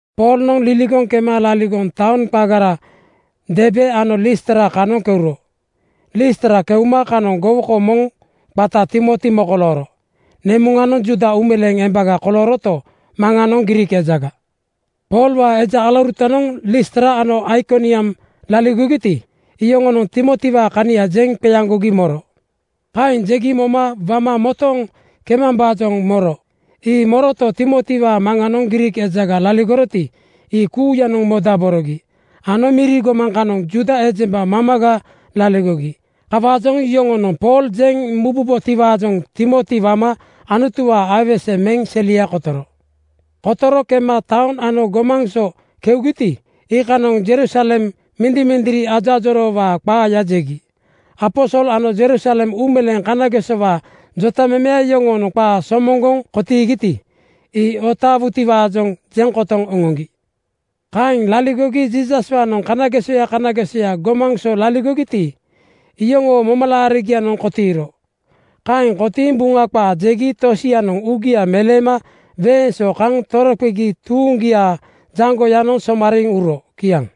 Poolnoŋ liligoŋ kema laligoŋ taoŋ qagara Derbe ano Listra kanoŋ keuro. Listra keuma kanoŋ gowoko moŋ qata Timoti mokolooro. Nemuŋanoŋ Juuda uumeleeŋ embaga kolooroto, maŋanoŋ Griik ejaga. Poolwaa eja alaurutanoŋ Listra ano Aikoniam laligogiti, iyoŋonoŋ Timotiwaa kania jeŋ qeaŋgogi moro. Kaeŋ jegi moma wama motooŋ kemambaajoŋ moro. Ii moroto, Timotiwaa maŋanoŋ Griik ejaga laligoroti, ii kuuyanoŋ modaborogi ano miri gomaŋ kanoŋ Juuda ejemba mamaga laligogi. Kawaajoŋ yoŋonoŋ Pool jeŋ mububotiwaajoŋ Timoti wama Anutuwaa aiwese meŋ selia kotoro. Kotoro kema taoŋ ano gomaŋ so keugiti, iikanoŋ Jerusalem mindimindiri ajoajoroowaa qaaya jegi. Aposol ano Jerusalem uumeleeŋ kanagesowaa jotamemeya yoŋonoŋ qaa somoŋgoŋ kotiigiti, ii otaawutiwaajoŋ jeŋ kotoŋ oŋoŋgi. Kaeŋ liligogi Jiisaswaanoŋ kanagesoya kanagesoya gomaŋ so laligogiti, iyoŋoo momalaarigianoŋ kotiiro. Kaeŋ kotiiŋ Buŋa qaa jegi tosianoŋ uugia meleema weeŋ so kaŋ toroqegi tuuŋgiaa jaŋgoyanoŋ somariiŋ uro. Kiaŋ.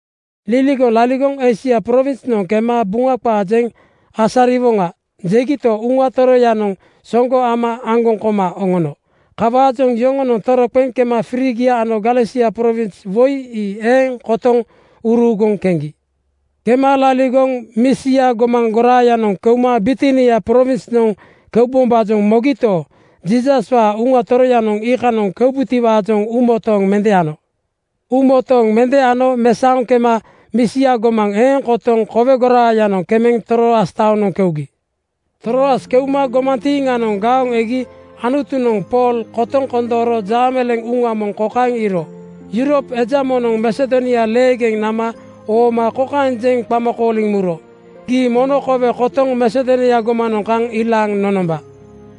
Liligoŋ laligoŋ “Eisia prowinsnoŋ kema Buŋa qaa jeŋ asariwoŋa,” jegito, Uŋa Toroyanoŋ soŋgo ama aŋgoŋ koma oŋono. Kawaajoŋ yoŋonoŋ toroqeŋ kema Frigia ano Galesia prowins woi ii eeŋ kotoŋ uruuguŋ keŋgi. Kema laligoŋ Misia gomaŋ goraayanoŋ keuma Bitinia prowinsnoŋ keubombaajoŋ mogito, Jiisaswaa Uŋa Toroyanoŋ iikanoŋ kembutiwaajoŋ uumotooŋ mende ano. Uumotooŋ mende ano mesaoŋ kema Misia gomaŋ eeŋ kotoŋ kowe goraayanoŋ kemeŋ Troas taonoŋ keugi. Troas keuma gomantiiŋanoŋ gaoŋ egi Anutunoŋ Pool kotoŋ kondooro jaameleeŋ uŋa moŋ kokaeŋ iiro: Yurop eja moŋnoŋ Masedonia leegeŋ nama ooma kokaeŋ jeŋ qama kooliŋ muro, “Gii mono kowe kotoŋ Masedonia gomanoŋ kaŋ ilaaŋ nonomba.”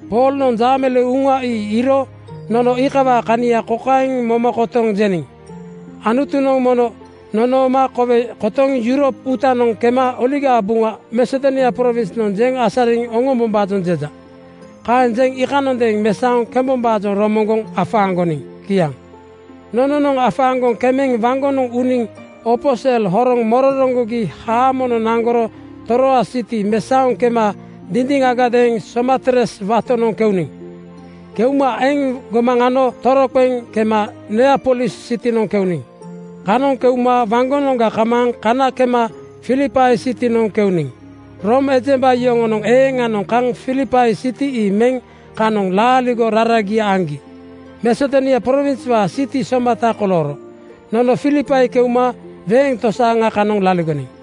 Poolnoŋ jaameleeŋ uŋa ii iiro nono iikawaa kania kokaeŋ moma kotoŋ jeniŋ, “Anutunoŋ mono nonooma kowe kotoŋ Yurop uutanoŋ kema Oligaa Buŋa Masedonia prowinsnoŋ jeŋ asariŋ oŋombombaajoŋ jeja.” Kaeŋ jeŋ iikanondeeŋ mesaoŋ kembombaajoŋ romoŋgoŋ afaaŋgoniŋ. Kiaŋ. Nononoŋ afaaŋgoŋ kemeŋ waŋgonoŋ uniŋ opo sel horoŋ mororoŋgogi haamonoŋ naŋgoro Troas siti mesaoŋ kema dindiŋagadeeŋ Samotres watonoŋ keuniŋ. Keuma eŋ gomaŋ ano toroqeŋ kema Neapolis sitinoŋ keuniŋ. Kanoŋ keuma waŋgonoŋga kamaaŋ kana kema Filipai sitinoŋ keuniŋ. Room ejemba yoŋonoŋ eeŋanoŋ kaŋ Filipai siti ii meŋ kanoŋ laaligo raragia aŋgi Masedonia prowinswaa siti somata kolooro. Nono Filipai keuma weeŋ tosaaŋa kanoŋ laligoniŋ.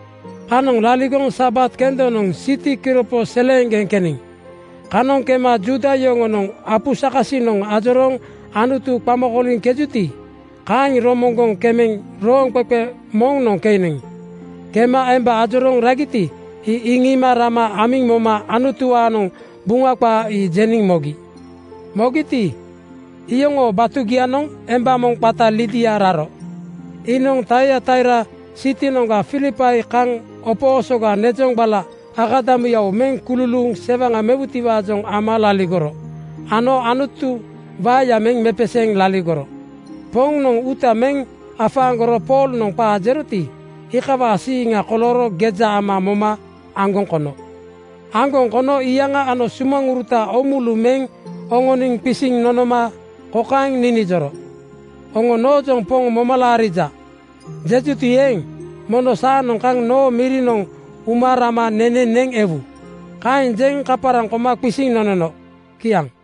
Kanoŋ laligoŋ Sabat kendonoŋ siti kiropo seleeŋgeŋ keniŋ. Kanoŋ kema ‘Juuda yoŋonoŋ apu sakasiŋanoŋ ajorooŋ Anutu qama kooliŋkejuti,’ kaeŋ romoŋgoŋ kemeŋ rooŋqeqe moŋnoŋ keniŋ. Kema emba ajorooŋ ragiti, ii iŋiima rama amiŋ moma Anutuwaanoŋ Buŋa qaa ii jeniŋ mogi. Mogiti, iyoŋoo batugianoŋ emba moŋ qata Lidia raro. Iinoŋ Taiataira sitinoŋga Filipai kaŋ opo osoga nezoŋgbala akadamuyawo meŋ kululuuŋ sewaŋa mewutiwaajoŋ ama laligoro ano Anutu waeya meŋ mepeseeŋ laligoro. Poŋnoŋ uuta meŋ afaaŋgoro Poolnoŋ qaa jeroti, iikawaajoŋ siiŋa kolooro geja ama moma aŋgoŋ kono. Aŋgoŋ kono iyaŋa ano sumaŋuruta oomulu meŋ oŋoniŋ qisiŋ nonoma kokaeŋ ninijoro, “Oŋo noojoŋ ‘Poŋ moma laarija,’ jejuti eeŋ, mono saanoŋ kaŋ noo mirinoŋ uma rama nene neŋ ewu.” Kaeŋ jeŋ kaparaŋ koma qisiŋ nonono. Kiaŋ.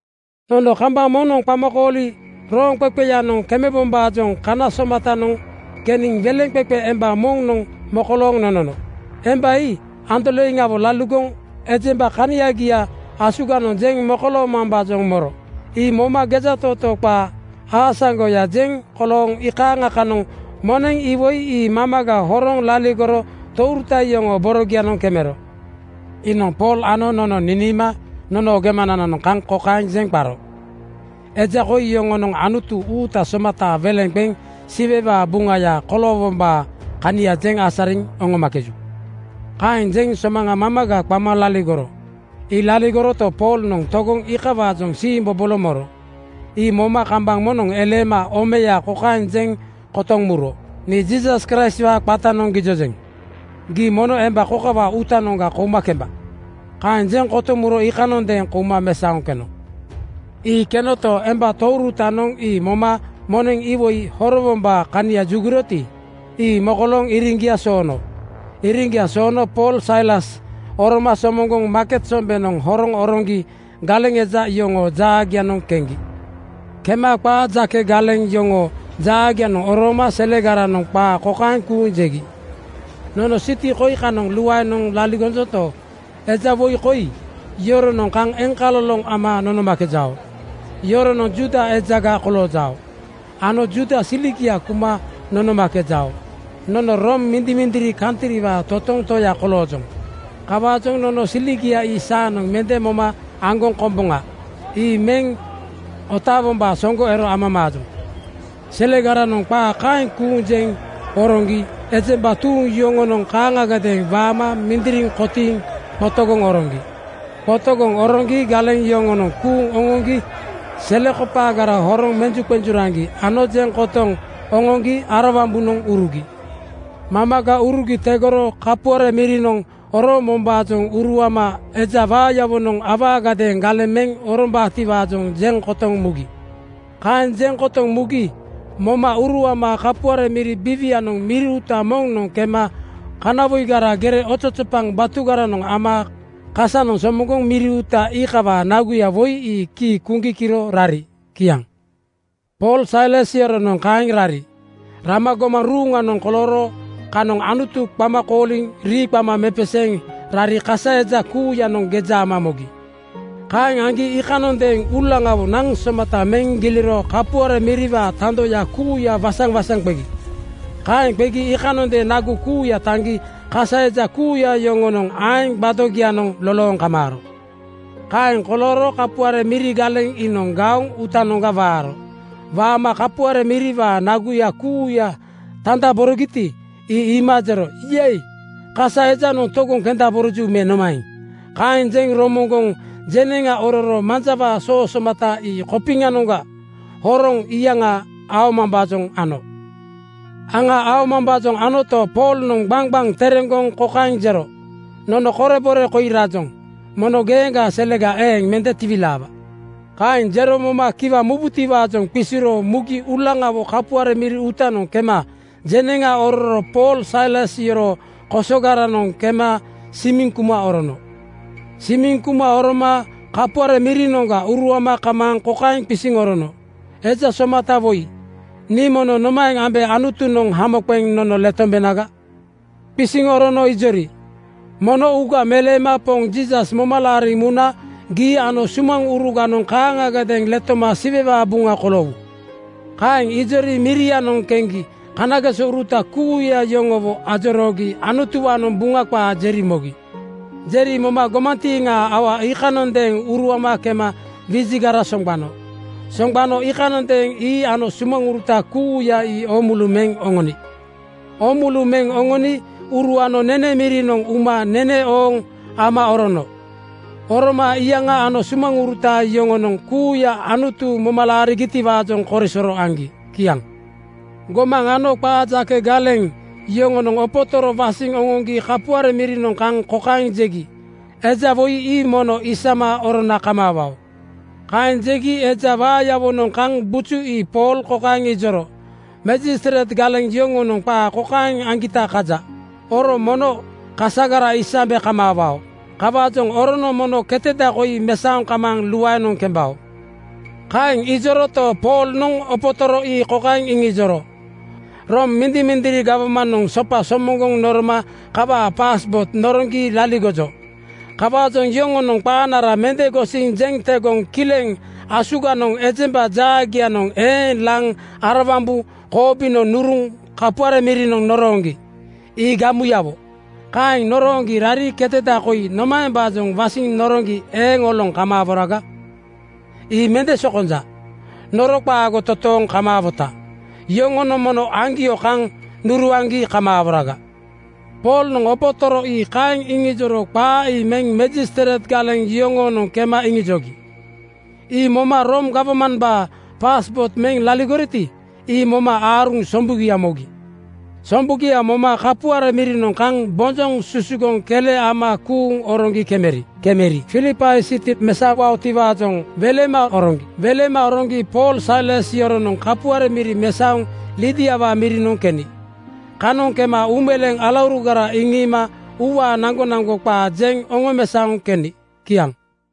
Nono kambaŋ moŋnoŋ qamakooli rooŋqeqeyanoŋ kemebombaajoŋ kana somatanoŋ keniŋ weleŋqeqe emba moŋnoŋ mokolooŋ nonono. Emba ii andoleiŋawo laligoŋ ejemba kaniagia asuganoŋ jeŋ mokoloomambaajoŋ moro. Ii moma gejatootoo qaa aasaŋgoya jeŋ kolooŋ iikaaŋa kanoŋ moneŋ iwoi ii mamaga horoŋ laligoro touruta yoŋoo borogianoŋ kemero. Iinoŋ Pool ano nono niniima nonoo gemanananoŋ kaŋ kokaeŋ jeŋ qaro, “Eja koi yoŋonoŋ Anutu uuta somataa weleŋa qeŋ Siwewaa buŋaya koloowombaa kania jeŋ asariŋ oŋomakeju.” Kaeŋ jeŋ somaŋa mamaga qama laligoro. Ii laligoroto, Poolnoŋ togoŋ iikawaajoŋ siimbobolo moro. Ii moma kambaŋ moŋnoŋ eleema omeya kokaeŋ jeŋ kotoŋ muro, “Nii Jiisas Kraistwaa qatanoŋ gijojeŋ: Gii mono emba kokawaa uutanoŋga kouma kemba!” Kaeŋ jeŋ kotoŋ muro iikanondeeŋ kouma mesaoŋ keno. Ii kenoto, emba tourutanoŋ ii moma moneŋ iwoi horowombaa kania juguroti, ii mokolooŋ iriŋgia soono. Iriŋgia soono Pool Sailas oroma somoŋgoŋ maaket sombeŋanoŋ horoŋ oroŋgi galeŋ eja yoŋoo jaagianoŋ keŋgi. Kema qaa jake galeŋ yoŋoo jaagianoŋ orooma selegaranoŋ qaa kokaeŋ kuuŋ jegi, “Nono siti koi kanoŋ luaenoŋ laligojonto, eja woi koi yoronoŋ kaŋ eŋkaloloŋ ama nonomakejao. Yoronoŋ Juuda ejaga koloojao ano Juuda siligia kuma nonomakejao. Nono Room mindimindiri kantriwaa totoŋ toya koloojoŋ. Kawaajoŋ nono siligia ii saanoŋ mende moma aŋgoŋ komboŋa. Ii meŋ otaawombaa soŋgo ero amamaajoŋ.” Selegaranoŋ qaa kaeŋ kuuŋ jeŋ oroŋgi ejemba tuuŋ yoŋonoŋ kaaŋagadeeŋ waama mindiriŋ kotiiŋ qotogoŋ oroŋgi. Qotogoŋ oroŋgi galeŋ yoŋonoŋ kuuŋ oŋoŋgi selekopaagara horoŋ menjuqen-juraŋgi ano jeŋ kotoŋ oŋoŋgi arawambunoŋ urugi. Mamaga urugi tegoro kapuare mirinoŋ oroombombaajoŋ uruama eja waayawonoŋ awaagadeeŋ galeŋ meŋ orombaatiwaajoŋ jeŋ kotoŋ mugi. Kaeŋ jeŋ kotoŋ mugi moma uruama kapuare miri biiwianoŋ miri uuta moŋnoŋ kema kanawoigara gere ozozopaŋ batugaranoŋ ama kasanoŋ somoŋgoŋ miri uuta iikawaa naguya woi ii kii kuŋgi kiro rari. Kiaŋ. Pool Sailas yoronoŋ kaeŋ rari. Rama gomaŋ ruuŋanoŋ kolooro kanoŋ Anutu qama kooliŋ rii qama mepeseeŋ rari kasa eja kuuyanoŋ geja ama mogi. Kaeŋ aŋgi iikanondeeŋ uulaŋawo naŋ somata meŋ giliro kapuare miriwaa tandoya kuuya waŋsaŋwaŋsaŋ qegi. Kaeŋ qegi iikanondeeŋ nagu kuuya taŋgi kasa eja kuuya yoŋoo aeŋ gbadogianoŋ (tape) lolooŋ kamaaro. Kaeŋ kolooro kapuare miri galeŋ iinoŋ gaoŋ uutanoŋga waaro. Waama kapuare miriwaa naguya kuuya tandaborogiti, ii iima jero, “Yei! Kasa ejanoŋ togoŋ kendaboroju me nomaeŋ?” Kaeŋ jeŋ romoŋgoŋ jeneŋa ororo manjawaa soo somata ii kopiŋanoŋga horoŋ iyaŋa aomambaajoŋ ano. Aŋa aomambaajoŋ anoto, Poolnoŋ gbaŋgbaŋ tereŋgoŋ kokaeŋ jero, “Nono korebore koi rajoŋ. Mono geeŋgaa selega eeŋ mende tiwilaawa.” Kaeŋ jero moma kiwa mubutiwaajoŋ qisiro mugi uulaŋawo kapuare miri uutanoŋ kema jeneŋa ororo Pool Sailas yoroo kosoga-ranoŋ kema simiŋ kuma orono. Simiŋ kuma oroma kapuare mirinoŋga uruama kamaaŋ kokaeŋ qisiŋ orono, “Eja somata woi, nii mono nomaeŋ ambe Anutunoŋ hamo qeŋ nono letombenaga?” Qisiŋ orono ijori, “Mono uuga meleema Poŋ Jiisas moma laariŋ muna gii ano sumaŋuruganoŋ kaaŋagadeeŋ letoma Siwewaa buŋa koloowu.” Kaeŋ ijori mirianoŋ keŋgi kanagesouruta kuuya yoŋowo ajoroogi Anutuwaanoŋ Buŋa qaa jeri mogi. Jeri moma gomantiiŋaa aua iikanondeeŋ uruama kema wijigara soŋgbano. Soŋgbano iikanondeeŋ ii ano sumaŋuruta kuuya ii oomulu meŋ oŋoni. Oomulu meŋ oŋoni uruano nene mirinoŋ uma nene ooŋ ama orono. Oroma iyaŋa ano sumaŋuruta yoŋonoŋ kuuya Anutu moma laarigitiwaajoŋ korisoro aŋgi. Kiaŋ. Gomaŋ ano qaa jake galeŋ (majistreit) yoŋonoŋ opotoro wasiŋ oŋoŋgi kapuare mirinoŋ kaŋ kokaeŋ jegi, “Eja woi ii mono isama orona kamaawao.” Kaeŋ jegi eja waayawonoŋ kaŋ buju ii Pool kokaeŋ ijoro, “Majistreit galeŋ yoŋonoŋ qaa kokaeŋ aŋgita kaja: Oro mono kasagara isambe kamaawao. Kawaajoŋ oronoŋ mono keteda koi mesaoŋ kamaaŋ luaenoŋ kembao.” Kaeŋ ijoroto, Poolnoŋ opotoro ii kokaeŋ iŋijoro, “Room mindimindiri gawmanoŋ sopa somoŋgoŋ noroma kawaa (jeŋkooto) paaspoot noroŋgi laligojo. Kawaajoŋ yoŋonoŋ qaanara mende gosiŋ jeŋ tegoŋ kileŋ asuganoŋ ejemba jaagianoŋ eeŋ laŋ arawambu koobinoŋ nuruŋ kapuare mirinoŋ norooŋgi. Ii gamuyawo. Kaeŋ norooŋgi rari keteda koi nomaembaajoŋ wasiŋ noroŋgi eeŋ oloŋ kamaaworaga? Ii mende sokonja. Noro qaago totooŋ kamaawoto, yoŋonoŋ mono aŋgio kaŋ nuruaŋgi kamaaworaga.” Poolnoŋ opotoro ii kaeŋ iŋijoro qaa ii meŋ majistreit galeŋ yoŋoonoŋ kema iŋijogi. Ii moma Room gawmambaa (jeŋkooto) paaspoot meŋ laligoriti, ii moma aaruŋ sombugia mogi. Sombugia moma kapuare mirinoŋ kaŋ bonjoŋ susugoŋ kele ama kuuŋ oroŋgi kemeri. Kemeri Filipai siti mesaowaotiwaajoŋ welema oroŋgi. Welema oroŋgi Pool Sailas yoronoŋ kapuare miri mesaoŋ Lidiawaa mirinoŋ keni. Kanoŋ kema uumeleeŋ alaurugara iŋiima uuwaa naŋgonaŋgo qaa jeŋ oŋomesaoŋ keni. Kiaŋ.